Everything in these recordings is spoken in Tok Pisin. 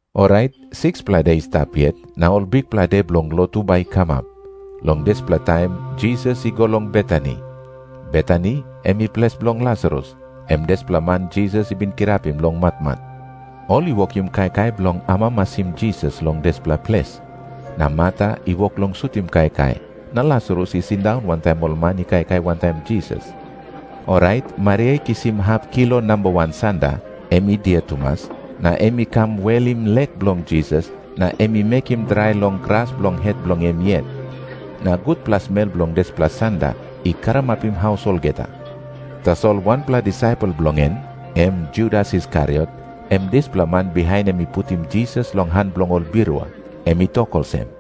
Orait 6-pela de i stap yet, na ol bikpela de bilong lotu bai i kamap. Long dispela taim Jisas i go long Betani. Betani em i ples bilong Lasarus, em dispela man Jisas i bin kirapim long matmat. Ol i wokim kaikai bilong amamasim Jisas long dispela ples. Na Marta i wok long sutim kaikai, na Lasarus i sindaun wantaim ol man i kaikai wantaim Jisas. Orait Maria i kisim hap kilo nambawan sanda, em i dia tumas, na em i kam welim lek bilong Jisas, na em i mekim drai long gras bilong het bilong em yet. Na gutpela smel bilong dispela sanda i karamapim haus olgeta. Tasol wanpela disaipel bilong en, em Judas Iskariot, em dispela man bihain em i putim Jisas long han bilong ol birua, em i tok olsem,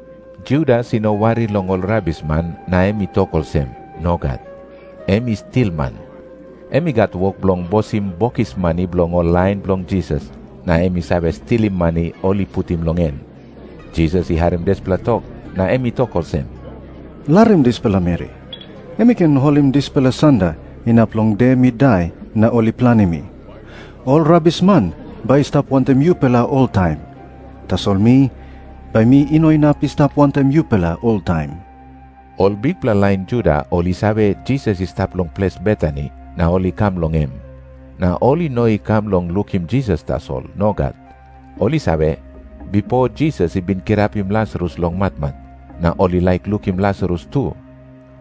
Judas i no wari long ol rabisman na em i tok olsem. Nogat. Em i stilman. Em i gat wok bilong bosim bokis mani bilong ol lain bilong Jisas, na em i save stilim mani ol i putim long en. Jisas i harim dispela tok na em i tok olsem, “Larim dispela meri. Em i ken holim dispela sanda inap long de mi dai na ol i planim mi. Ol rabisman bai i stap wantaim yupela oltaim. Tasol mi, bai mi no inap i stap wantaim yupela oltaim.” Ol bikpela lain Juda ol i save, Jisas i stap long ples Betani, na ol i kam long em. Na ol i no i kam bilong lukim Jisas tasol. Nogat. Ol i save, bipo Jisas i bin kirapim Lasarus long matmat, na ol i laik lukim Lasarus tu.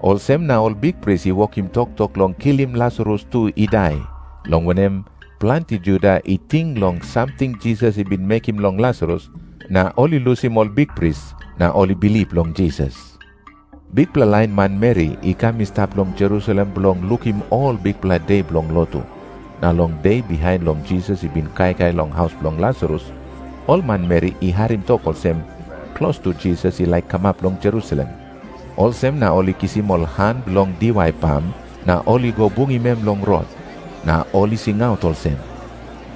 Olsem na ol bikpris i wokim toktok long kilim Lasarus tu i dai, long wanem, planti Juda i ting long samting Jisas i bin mekim long Lasarus, na ol i lusim ol bikpris na ol i bilip long Jisas. Bikpela lain manmeri i kam i stap long Jerusalem bilong lukim ol bikpela de bilong lotu. Na long de bihain long Jisas i bin kaikai long haus bilong Lasarus, ol manmeri i harim tok olsem, klostu Jisas i laik kamap long Jerusalem. Olsem na ol i kisim ol han bilong diwai pam na ol i go bungim em long rot. Na ol i singaut olsem,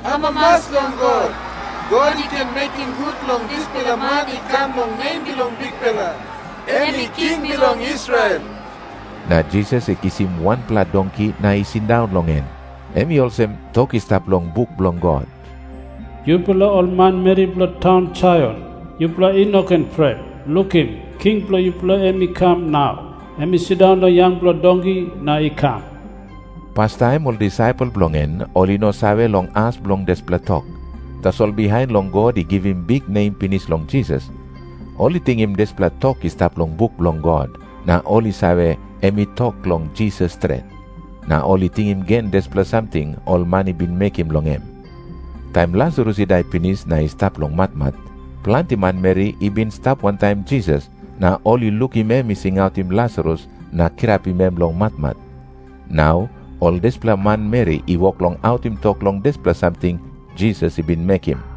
“Amamas long God. God i ken mekim gut long dispela man i kam long nem bilong Bikpela. Em i king bilong Israel.” Na Jisas i kisim wanpela donki na i sindaun long en. Em i olsem tok i stap long buk bilong God, “Yupela ol manmeri bilong taun Saion, yupela i no ken pret. Lukim. King bilong yupela em i kam nau. Em i sindaun long yangpela donki na i kam.” Pastaim ol disaipel bilong en, ol i no save long as bilong dispela tok. Tasol bihain long God i givim biknem pinis long Jisas, ol i tingim dispela tok i stap long buk bilong God, na ol i save, em i tok long Jisas stret. Na ol i tingim gen dispela samting ol man i bin mekim long em. Taim Lasarus i dai pinis na i stap long matmat, planti manmeri i bin stap wantaim Jisas na ol i lukim em i singautim Lasarus na kirapim em long matmat. Nau ol dispela manmeri i wok long autim tok long dispela samting Jisas i bin mekim.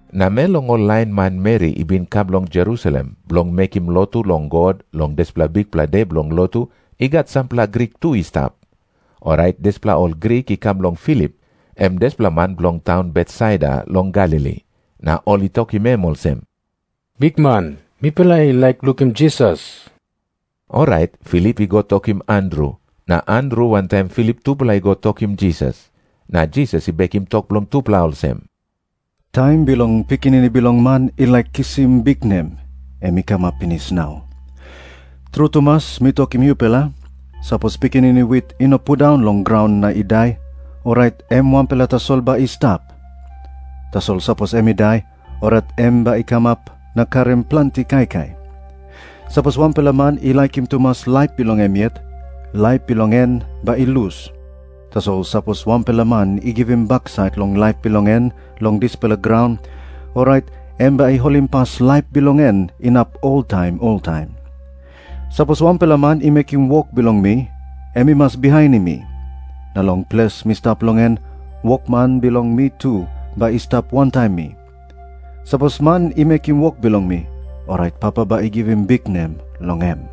Namel long ol lain manmeri i bin kam long Jerusalem bilong mekim lotu long God long dispela bikpela de bilong lotu i gat sampela Grik tu i stap. Orait dispela ol Grik i kam long Filip, em dispela man bilong taun Betsaida long Galili. Na ol i tokim em olsem, “Bikman, mipela i laik lukim Jisas.” Orait Filip i go tokim Andru. Na Andru wantaim Filip tupela i go tokim Jisas. Na Jisas i bekim tok bilong tupela olsem, “Taim bilong Pikinini Bilong Man i laik kisim biknem, em i kamap pinis nau. Tru tumas mi tokim yupela, sapos pikinini wit i no pundaun long graun na i dai, orait em wanpela tasol bai i stap. Tasol sapos em i dai, orait em bai i kamap na karim planti kaikai. Sapos wanpela man i laikim tumas laip bilong em yet, laip bilong en bai i lus. Tasol sapos wanpela man i givim baksait long laip bilong en long dispela graun, orait em bai i holimpas laip bilong en inap oltaim oltaim. Sapos wanpela man i mekim wok bilong mi, em i mas bihainim mi. Na long ples mi stap long en, wokman bilong mi tu bai i stap wantaim mi. Sapos man i mekim wok bilong mi, orait Papa bai i givim biknem long em.”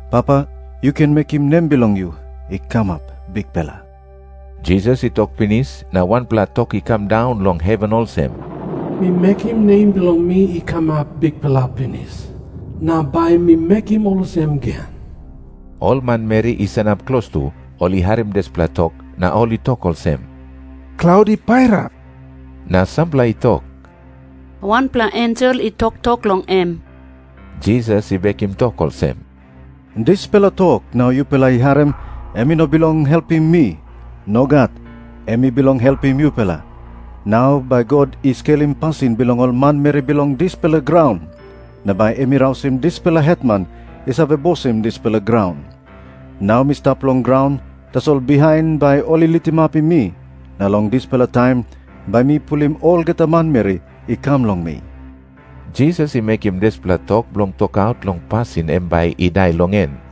Papa, yu ken mekim nem bilong yu i kamap bikpela.” Jisas i tok pinis na wanpela tok i kam daun long heven olsem, “Mi mekim nem bilong mi i kamap bikpela pinis, na bai mi mekim olsem gen.” Ol manmeri i sanap klostu, ol i harim dispela tok, na ol i tok olsem, “Klaut i pairap.” Na sampela i tok, “Wanpela ensel i toktok long em.” Jisas i bekim tok olsem, “Dispela tok nau yupela i harim, em i no bilong helpim mi. Nogat. Em i bilong helpim yupela. Nau bai God i skelim pasin bilong ol manmeri bilong dispela graun. Nau bai em i rausim dispela hetman i save bosim dispela graun. Nau mi stap long graun, tasol bihain bai ol i litimapim mi, na long dispela taim bai mi pulim olgeta manmeri i kam long mi.” Jisas i mekim dispela tok bilong tokaut long pasin em bai i dai long en.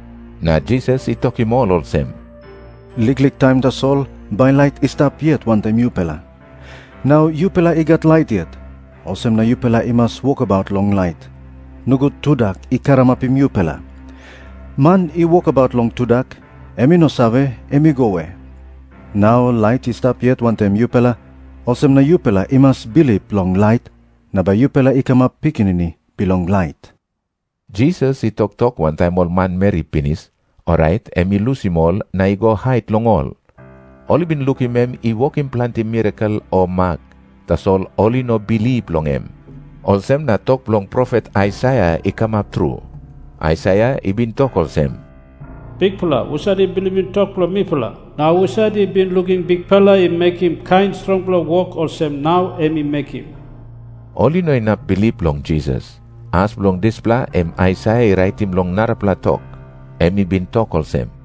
Na Jisas i tokim ol olsem, “Liklik taim tasol bai lait i stap yet wantaim yupela. Nau yupela i gat lait yet, olsem na yupela i mas wokabaut long lait, nogut tudak i karamapim yupela. Man i wokabaut long tudak, em i no save, em i go we. Nau lait i stap yet wantaim yupela, olsem na yupela i mas bilip long lait, na bai yupela i kamap pikinini bilong lait.” Jisas i toktok wantaim ol manmeri pinis, orait em i lusim ol na i go hait long ol. Ol i bin lukim em i wokim planti mirakel o mak, tasol ol i no bilip long em. Olsem na tok bilong profet Aisaia i kamap tru. Aisaia i bin tok olsem, “Bikpela, husat i bilipim tok bilong mipela? Na husat i bin lukim Bikpela i mekim kain strongpela wok olsem nau em i mekim?” Ol i no inap bilip long Jisas. As bilong dispela em Aisaia i raitim long narapela tok. Em i bin tok olsem,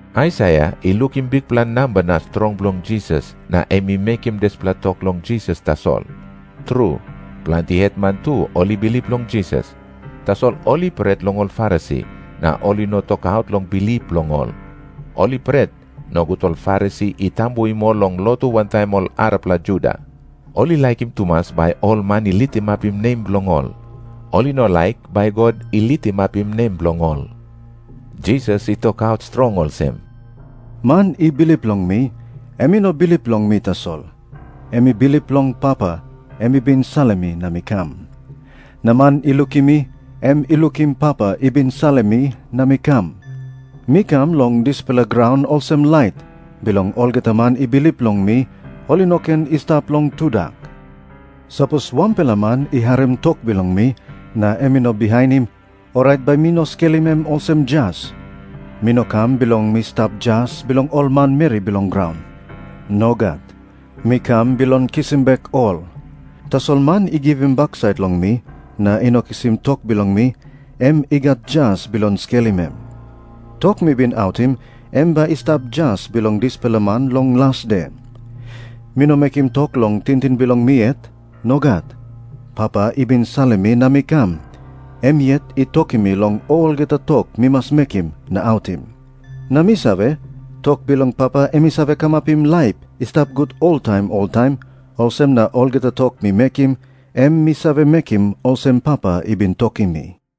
Aisaia i lukim bikpela namba na strong bilong Jisas na em i mekim dispela tok long Jisas tasol. Tru, planti hetman tu ol i bilip long Jisas. Tasol ol i pret long ol Farisi, na ol i no tokaut long bilip bilong ol. Ol i pret, nogut ol Farisi i tambuim ol long lotu wantaim ol arapela Juda. Ol i laikim tumas bai ol man i litimapim nem bilong ol. Ol i no laik bai God i litimapim nem bilong ol. Jisas i tokaut strong olsem, “Man i bilip long mi, em i no bilip long mi tasol. Em i bilip long Papa, em i bin salim mi na mi kam. Na man i lukim mi, em i lukim Papa i bin salim mi na mi kam. Mi kam long dispela graun olsem lait, bilong olgeta man i bilip long mi ol i no ken i stap long tudak. Sapos wanpela man i harim tok bilong mi na em i no bihainim, orait bai mi no skelim em olsem jas. Mi no kam bilong mi stap jas bilong ol manmeri bilong graun. Nogat. Mi kam bilong kisim bek ol. Tasol man i givim baksait long mi na i no kisim tok bilong mi, em i gat jas bilong skelim em. Tok mi bin autim, em bai i stap jas bilong dispela man long las de. Mi no mekim tok long tingting bilong mi yet. Nogat. Papa i bin salim mi na mi kam, em yet i tokim mi long olgeta tok mi mas mekim na autim. Na mi save, tok bilong Papa em i save kamapim laip i stap gut oltaim oltaim. Olsem na olgeta tok mi mekim, em mi save mekim olsem Papa i bin tokim mi.”